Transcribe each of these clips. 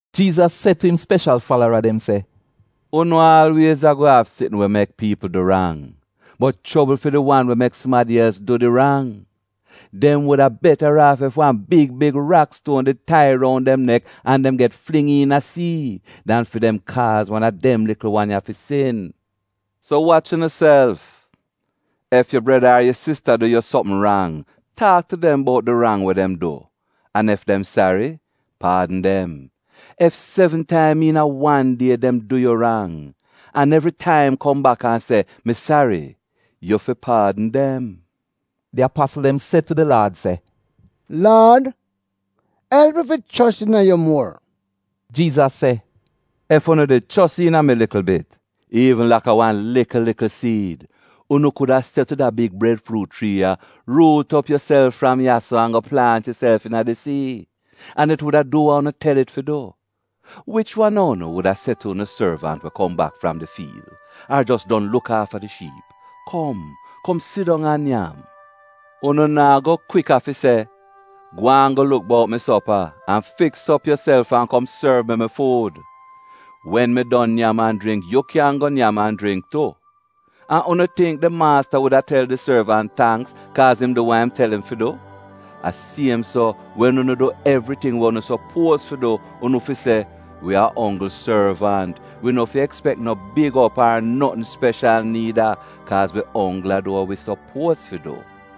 Jiizas se tu im speshal falara dem se, “Unu aalwiez a-go av sitn we mek piipl du rang, bot chobl fi di wan we mek sumadi els du di rang. Dem wuda betaraaf ef wan big big rakstuon did tai roun dem nek an dem get fling iina sii, dan fi dem kaaz wan a dem likl wan ya fi sin. So wach unuself! Ef yu breda ar yu sista du yu sopm rang, taak tu dem bout di rang we dem du an ef dem sari, paadn dem. Ef sevn taim iina wan die, dem du yu rang, an evritaim kom bak an se, ‘Mi sari,’ yu fi paadn dem.” Di apasl dem se tu di Laad se, “Laad, elp wi fi chos iina yu muor!” Jiizas se, “Ef unu did chos iina mi likl bit, iivn laka wan likl likl siid, unu kuda se tu da big bredfruut chrii ya, ‘Ruut op yuself fram ya-so an go plaant yuself iina di sii,’ an it wuda du wa unu tel it fi du. “Wich wan a unu wuda se tu unu sorvant we kom bak fram di fiil ar jos don luk aafa di shiip, ‘Kom, kom sidong an nyam’? Unu naa go kwika fi se, ‘Gwaan go luk bout mi sopa, an fiks op yuself an kom sorv mi mi fuud. Wen mi don nyam an jringk, yu kyan go nyam an jringk tu.’ An unu tingk di maasta wuda tel di sorvant tangks kaaz im du wa im tel im fi du? A siem so, wen unu du evriting we unu sopuoz fi du, unu fi se, “Wi a onggl sorvant, wi no fi ekspek no big op ar notn speshal niida, kaaz wi onggl a du wa wi sopuoz fi du.”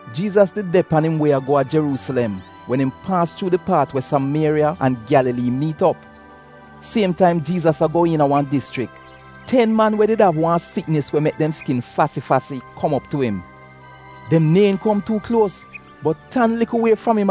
Jiizas did de pan im wie a go a Jeruusilem wen im paas chuu di paat we Samieriya an Gyalalii miit op. Siem taim Jiizas a go iina wan dischrik, ten man we did av wan siknis we mek dem skin fasi-fasi, kom op tu im. Dem neehn kom tuu kluos, bot tan likl wie fram im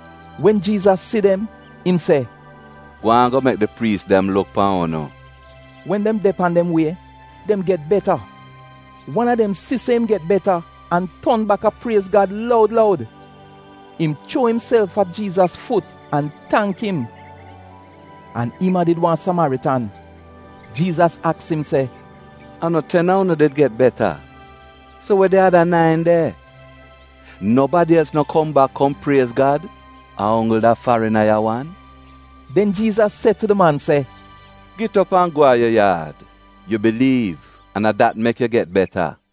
Wen Jiizas si dem, im se, “Gwaan go mek di priis dem luk pan unu.” Wen dem de pan dem wie, dem get beta. Wan a dem si se im get beta an ton baka priez Gad loud loud. Im chuo imself a Jiizas fut an tangk im. An im a did wan Samaritan. Jiizas aks im se, “A no ten a unu did get beta? So we di ada nain de? Nobadi els no kom bak kom priez Gad? A onggl da farina ya wan?” Den Jiizas se tu di man se, “Git op an go a yu yaad, yu biliiv an a dat mek yu get beta.”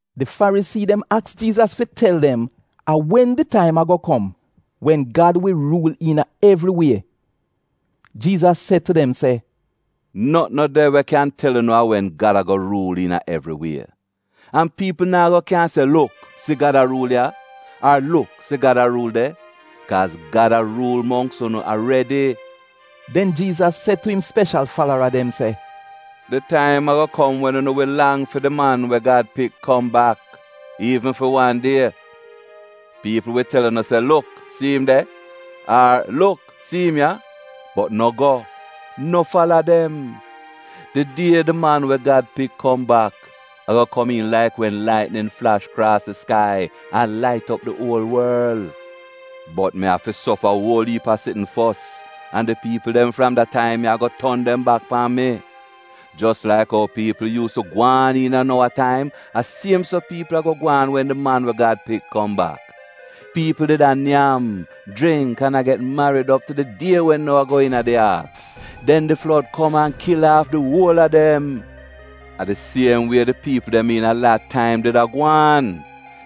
Di Farisii dem aks Jiizas fi tel dem a wen di taim a-go kom wen Gad wi ruul iina evri wie. Jiizas se tu dem se, “Notn no de we kyan tel unu a wen Gad a-go ruul iina evri wie, an piipl naa go kyan se, ‘Luk, si Gad a ruul ya!’ ar ‘Luk, si Gad a ruul de,’ kaaz Gad a ruul mongks unu aredi.” Den Jiizas se tu im speshal falara dem se, “Di taim a-go kom wen unu wi lang fi di Man we Gad Pik kom bak, iivn fi wan die. Piipl wi tel unu se, ‘Luk, si im de!’ ar ‘Luk, si im ya!’ Bot no go, no fala dem. Di die di Man we Gad Pik kom bak, a-go komiin laik wen laitnin flash kraas di skai an lait op di uol worl. Bot mi afi sofa uol iip a sitn fos an di piipl dem fram da taim ya a-go ton dem bak pan mi. “Jos laik ou piipl yuus tu gwaan iina Nowa taim, a siem so piipl a-go gwaan wen di Man we Gad Pik kom bak. Piipl did a nyam, jringk, an a get marid op tu di die wen Nowa go iina di aak. Den di flod kom an kil aaf di uol a dem. “A di siem wie di piipl dem iina Lat taim did a gwaan.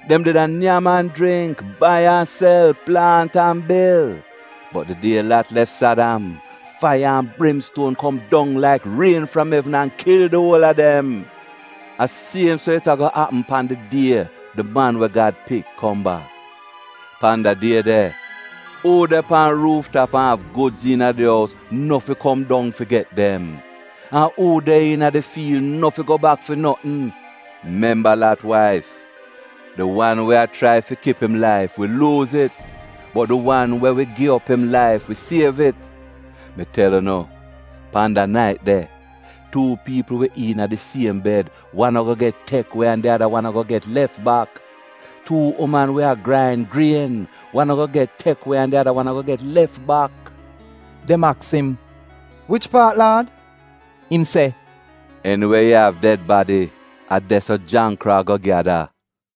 Dem did a nyam an jringk, bai an sel, plaant an bil. Bot di die Lat lef Sadam, faiya an brimstuon kom dong laik rien fram evn an kil di uol a dem. “A siem so it a-go apm pan di die di Man we Gad Pik kom bak. Pan da die de, uu de pan ruuf tap an av gudz iina di ous, no fi go dong fi get dem. An uu de iina di fiil no fi go bak fi notn. Memba Lat waif! Di wan we a chrai fi kip im laif, wi luuz it, bot di wan we wi gi op im laif, wi siev it. Mi tel unu, pan da nait de, tuu piipl wi iina di siem bed, wan a-go get tek we an di ada wan a-go get lef bak. Tuu uman wi a grain grien, wan a-go get tek we an di ada wan a-go get lef bak.” Dem aks im, “Wich paat Laad?” Im se, “Eniwe yu av ded badi, a de-so jangkro a-go gyada.”